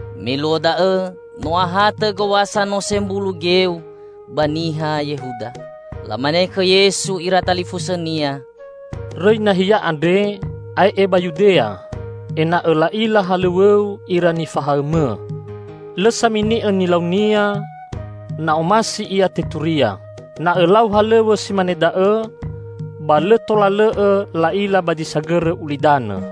Me luo da'õ no ahatõ Gowasa Nose Mbulu Geu ba niha Yehuda. Lamane khõ Yesu ira talifusõ-Nia, "Rõi nahia andre ae'e ba Yudea, ena'õ la'ila halõw̃õ-U ira nifahaõ-Mõ. Lõ samini'õ nilaunia, na omasi ia teturia. Na Õlau halõw̃õ si mane da'õ, ba lõ tola lõ'õ la'ila ba zi sagõrõ ulidanõ!"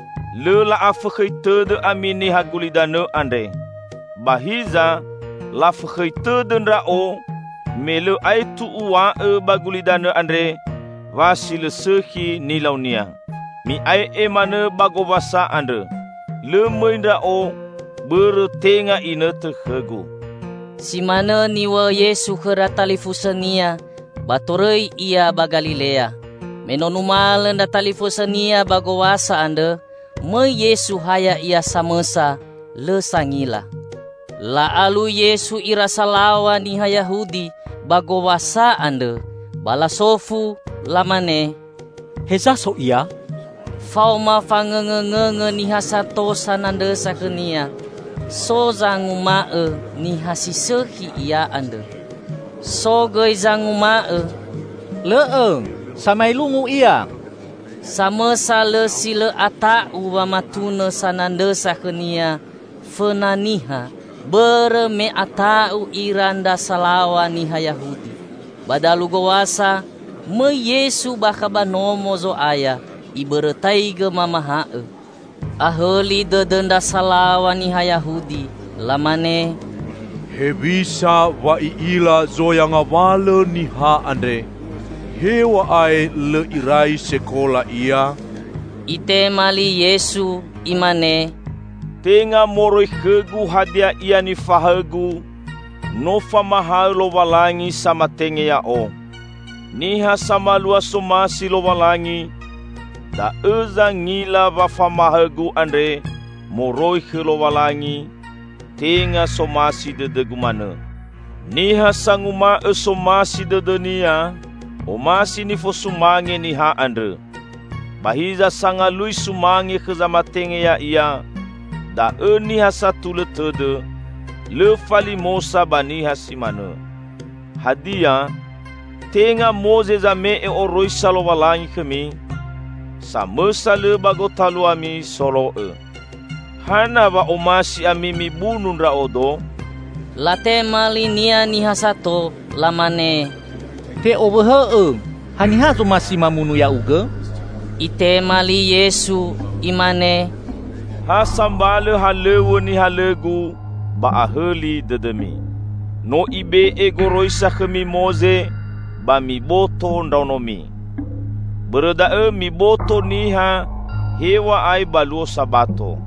Lõ la'afõkhõi tõdõ ami niha gulidanõ andre. Ba hiza lafõkhõi tõdõ Ndra'o me lõ aetu Uw̃a'õ ba gulidanõ andre wa si lõ sõkhi nilaunia. Mi'ae'e manõ ba Gowasa andrõ. Lõ mõi Ndra'o bõrõ tenga inõtõ khõ-Gu." Si manõ niw̃a'õ Yesu khõ ndra talifusõ-Nia, ba torõi Ia ba Galilea. Me no numalõ ndra talifusõ-Nia ba Gowasa andrõ, mõi Yesu ha Ya'ia samõsa lõ sangila. La'alui Yesu ira salaw̃a niha Yahudi ba Gowasa andrõ ba lasofu lamane, "Heza so Ia?" Faoma fangõngõngõngõ niha sato sanandrõsa khõ-Nia. So zanguma'õ Niha si sõkhi Ia andrõ: "So gõi zanguma'õ. Lõ'õ! Samaelungu Ia!" Samõsa lõ si lõ ata'u wamatunõ sanandrõsa khõ-Nia fõna niha bõrõ me ata'u ira ndra salaw̃a niha Yahudi. Ba dalu Gowasa, mõi Yesu bakha ba Nomo Zo'aya, Ibõrõtaigõ mamahaõ. Ahõli dõdõ ndra salaw̃a niha Yahudi. Lamane, "Hewisa wa I'ila zoya ngawalõ niha andre, hew̃a'ae lõ irai sekola Ia?" Itema li Yesu Imane, "Tenga moroi khõ-Gu hadia ia nifahaõ-Gu, no famahaõ Lowalangi samatenge Ya'o. Niha samalua somasi Lowalangi, da'õ zangila wa famahaõ-Gu andre moroi khõ Lowalangi, tenga somasi dõdõ-Gu manõ. Niha sanguma'õ somasi dõdõnia, omasi nifosumange niha andrõ. Ba hiza sangalui sumange khõ zamatenge ya'ia, da'õ niha satulõ tõdõ: lõ falimosa ba niha si manõ. Hadia, tenga Moze zame'e oroisa Lowalangi khõmi? Samõsa lõ ba gotaluami solo'õ. Hana wa omasi ami mibunu Ndra'odo?" Latema li-Nia niha sato, lamane, "Te owõhõ'õ! Haniha zomasi mamunu Ya'ugõ?" Itema li Yesu imane, "Ha sambalõ halõw̃õ nihalõ-Gu, ba ahõli dõdõmi. No ibe'e goroisa khõmi Moze ba miboto ndraonomi. Bõrõ da'õ miboto niha, hew̃a'ae ba luo Sabato.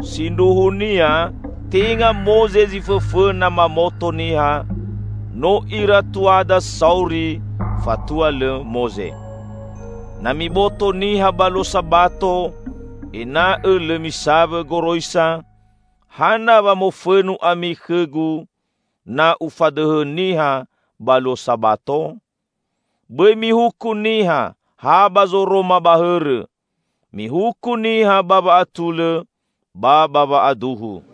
Sindruhunia tenga Moze zi fõfõna mamoto niha, no ira tuada sauri fatua lõ Moze. Na miboto niha ba luo Sabato ena'õ lõ misawõ goroisa Moze, hana wa mofõnu ami khõ-Gu na Ufadõhõ niha ba luo Sabato? Bõi mihuku niha ha ba zoroma ba hõrõ, mihuku niha ba wa'atulõ ba ba wa'aduhu."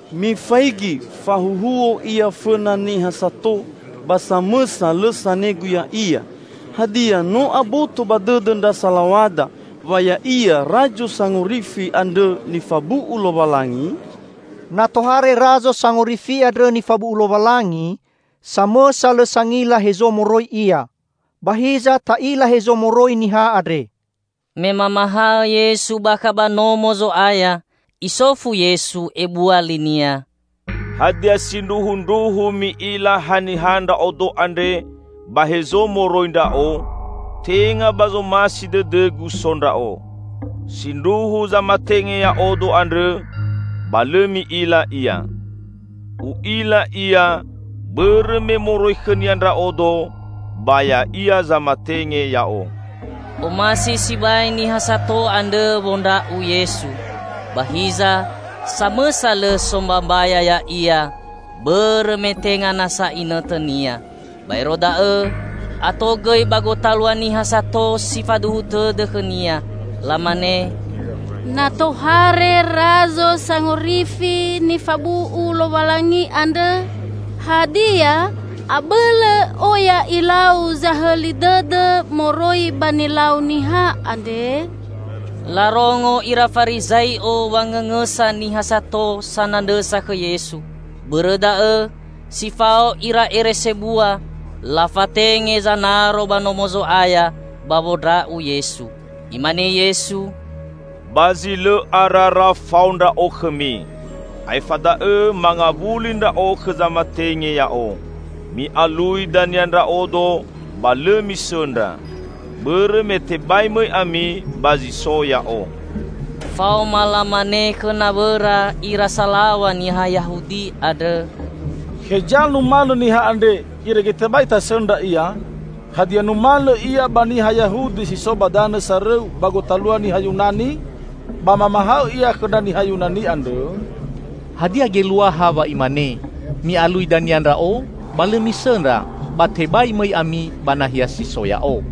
Mifaigi! Fahuhuo Ia fõna niha sato ba samõsa lõ sanegu Ya'ia! Hadia, no aboto ba dõdõ ndra salaw̃ada wa Ya'ia Razo Sangorifi andrõ nifabu'u Lowalangi? Na tohare Razo Sangorifi andrõ nifabu'u Lowalangi, samõsa lõ sangila hezo moroi Ia! Ba hiza, ta'ila hezo moroi niha andre." Me mamahaõ Yesu bakha ba Nomo Zo'aya, Isofu Yesu ebua li-Nia, "Hadia sindruhundruhu mi'ila haniha Ndra'odo andre ba hezo moroi Ndra'o? Tenga ba zomasi dõdõ-Gu so Ndra'o. Sindruhu zamatenge Ya'odo andrõ, ba lõ mi'ila Ia. U'ila Ia, bõrõ me moroi khõ-Nia Ndra'odo ba Ya'ia zamatenge Ya'o." Omasi sibai niha sato andrõ wondra'u Yesu, ba hiza samõsa lõ sombambaya Ya'ia bõrõ me tenga nasa inõtõ-Nia. Baero da'õ, ato gõi ba gotalua niha sato si faduhu tõdõ khõ-Nia, lamane, "Na tohare Razo Sangorifi nifabu'u Lowalangi andrõ, hadia abõlõ oya ilau zahõli dõdõ moroi ba nilau niha andre?" Larongo ira Farizai'o wangõngõsa niha sato sanandrõsa khõ Yesu. Bõrõ da'õ, si fao ira ere sebua lafatenge zanaro ba Nomo Zo'aya ba wondra'u Yesu. Imane Yesu, "Ba zi lõ arara fao Ndra'o khõmi. Aefa da'õ mangawuli Ndra'o khõ zamatenge Ya'o. Mi'alui dania Ndra'odo, ba lõ misõndra; bõrõ me tebai mõi ami ba zi so Ya'o." Faoma lamane khõ nawõra ira salaw̃a niha Yahudi andrõ, "Heza numalõ niha andre, irege tebai tasõndra Ia? Hadia numalõ Ia ba niha Yahudi si so ba danõ sarõu ba gotalua niha Yunani, ba mamahaõ Ia khõ ndra niha Yunani andrõ? Hadia geluaha wa Imane, 'Mi'alui dania Ndra'o ba lõ misõndra, ba tebai mõi ami ba nahia si so Ya'o.'"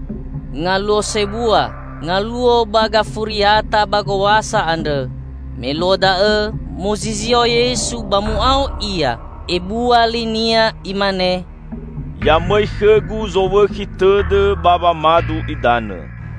Ngaluo sebua, ngaluo ba gafuriata ba gowasa andrõ. Me luo da'õ muzizio Yesu ba mu'ao Ia ebua li-Nia Imane, "Ya mõi khõ-Gu zowõkhi tõdõ ba wamadu idanõ.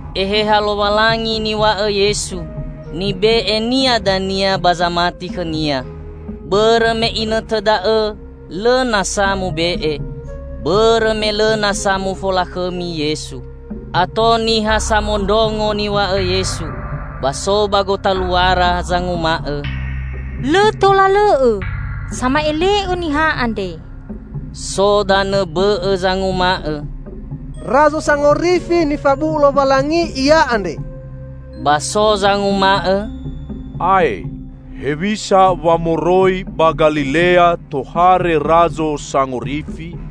(Eheha Lowalangi niw̃a'õ Yesu, nibe'e-Nia dania ba zamati khõ-Nia. Bõrõ me inõtõ da'õ lõ nasa mube'e; bõrõ me lõ nasa mufolakhõmi Yesu.) Ato niha samondrongo niw̃a'õ Yesu. Ba so ba gotaluara zanguma'õ, "Lõ tola lõ'õ sama'ele'õ niha andre!" So danõ bõ'õ zanguma'õ, "Razo Sangorifi nifabu'u Lowalangi Ia andre!" Ba so zanguma'õ, "Ae, hewisa wa moroi ba Galilea tohare Razo Sangorifi?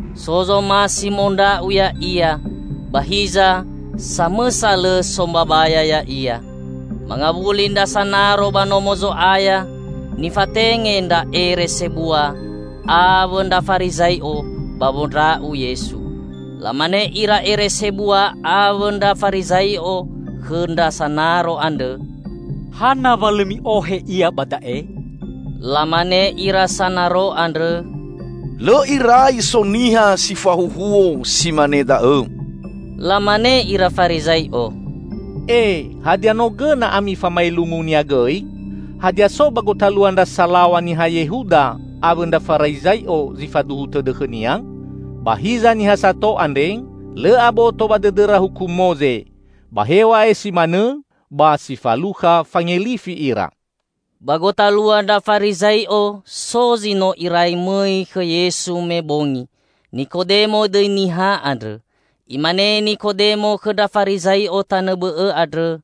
So zomasi mondra'u Ya'ia, ba hiza samõsa lõ sombambaya Ya'ia. Mangawuli ndra sanaro ba Nomo Zo'aya nifatenge ndra ere sebua awõ ndra Farizai'o ba wondra'u Yesu. Lamane ira ere sebua awõ ndra Farizai'o khõ ndra sanaro andrõ, "Hana wa lõ mi'ohe Ia ba da'e?" Lamane ira sanaro andrõ, "Lõ irai so niha si fahuhuo si mane da'õ!" Lamane ira Farizai'o, "E, hadia no gõna ami famaelungu-Nia gõi?" "Hadia so ba gotalua ndra salaw̃a niha Yehuda awõ ndra Farizai'o zi faduhu tõdõ khõ-Nia? Ba hiza niha sato andre, lõ aboto ba dõdõra huku Moze, ba hew̃a'ae si manõ ba si falukha fangelifi ira." Ba gotalua ndra Farizai'o so zi no irai mõi khõ Yesu me bongi; Nikodemo dõi niha andrõ. Imane Nikodemo khõ ndra Farizai'o tanõ bõ'õ andrõ,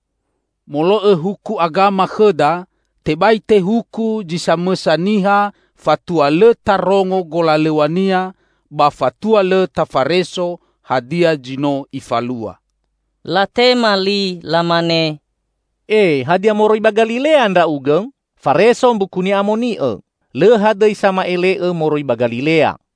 "Molo'õ huku agama khõda, tebai tehuku zi samõsa niha fatua lõ tarongo golalõw̃ania, ba fatua lõ tafareso hadia zi no ifalua." Latema li lamane, "E, hadia moroi ba Galilea ndra'ugõ?" Fareso Mbuku Ni'amoni'õ: "Lõ hadõi sama'ele'õ moroi ba Galilea!"